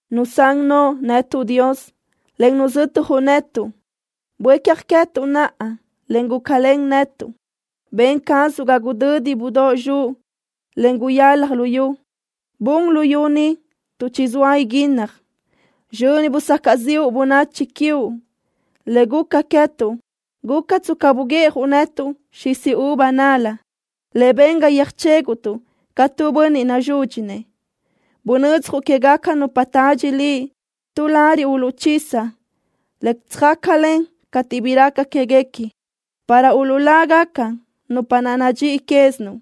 Nusán noʼo netuʼ, Dios, en nuzötjuʼ netuʼ. Buécja queë́tuʼ naʼa, en gúcalen netuʼ. Ben cazuʼ ga gudödi budóʼ zxuʼ, en guyalaj luyú. Bun luyú ni tuʼ chizóa iguínnaj. Sizxöni busacaʼ ziʼu bönachi quiuʼ. Le guca queë́tuʼ guca tsca buguiʼjuʼ netuʼ xis uva nal-la le ben ga yöjchéguʼtuʼ ca tu bönniʼ nazúdxinëʼ. Bunödzjuʼ quégaca nupa tadxi Liʼ tu lariʼ uluʼchisa, le söjácalen cateʼ bi raca quéguequi, para uluʼlágaca nupa naʼ nadxíʼi quézinuʼ.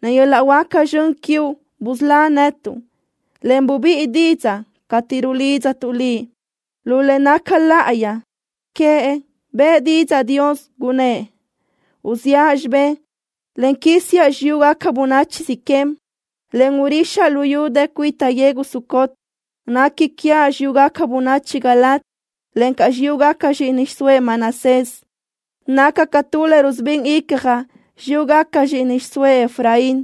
Len yöl-laʼ huáca zxön quiuʼ busölá netuʼ, en bubíʼi didzaʼ cateʼ rulidztuʼ Liʼ. Lu le naca láʼayi queëʼ bëʼë didzaʼ Dios, gunnë́ʼ: “Uziʼa xibé, en quísiaʼ xiyúgaca bönachi Siquem, en urixaʼ luyú dë cuita yegu Sucot. Nequi quiaʼ xiyúgaca bönachi Galaad, encaʼ xiyúgaca zxíʼini xiʼsóëʼ Manasés. Naca ca tu le rusubín icjaʼ xiyúgaca zxíʼini xiʼsóëʼ Efraín.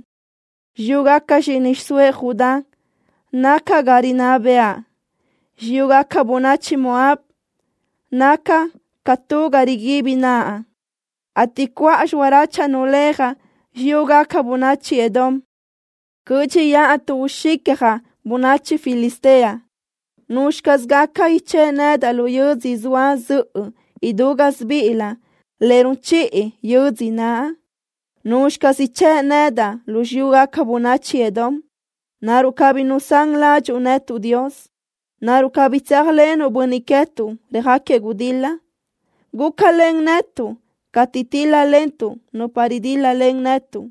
Xiyúgaca zxíʼini xiʼsóëʼ Judá naca ga rinná bëʼa. Xiyúgaca bönachi Moab naca ca tu ga riguibi naʼa, ateʼ cuʼa lölaʼ uléajaʼ xiyúgaca bönachi Edom. Cö́dxiʼa tuʼ uxicjaʼ bönachi Filistea.” ¿Nuzxi caz gaca ichë́ʼ nedaʼ lu yödzö zoa zöʼö idú gásibiʼilö le run chiʼi yödzö naʼ? ¿Nuzxi caz ichë́ʼ nedaʼ lu xiyúgaca bönachi Edom? ¿Naruʼ cabí nusán ládxuʼu netuʼ, Dios? ¿Naruʼ cabí tséajlenuʼ bönniʼ queë́tuʼ röjáquiëʼ gudil-la? Gúcalen netuʼ cateʼ tíl-lalentuʼ nupa ridíl-lalen netuʼ,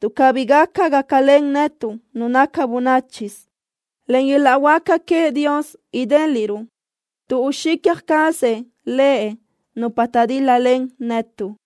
tuʼ cabí gaca gácalen netuʼ nu naca bönáchisö. Len yöl-laʼ huáca queëʼ Dios idéliʼruʼ tuʼ uxicja cazëʼ Lëʼ nupa taʼdíl-lalen netuʼ.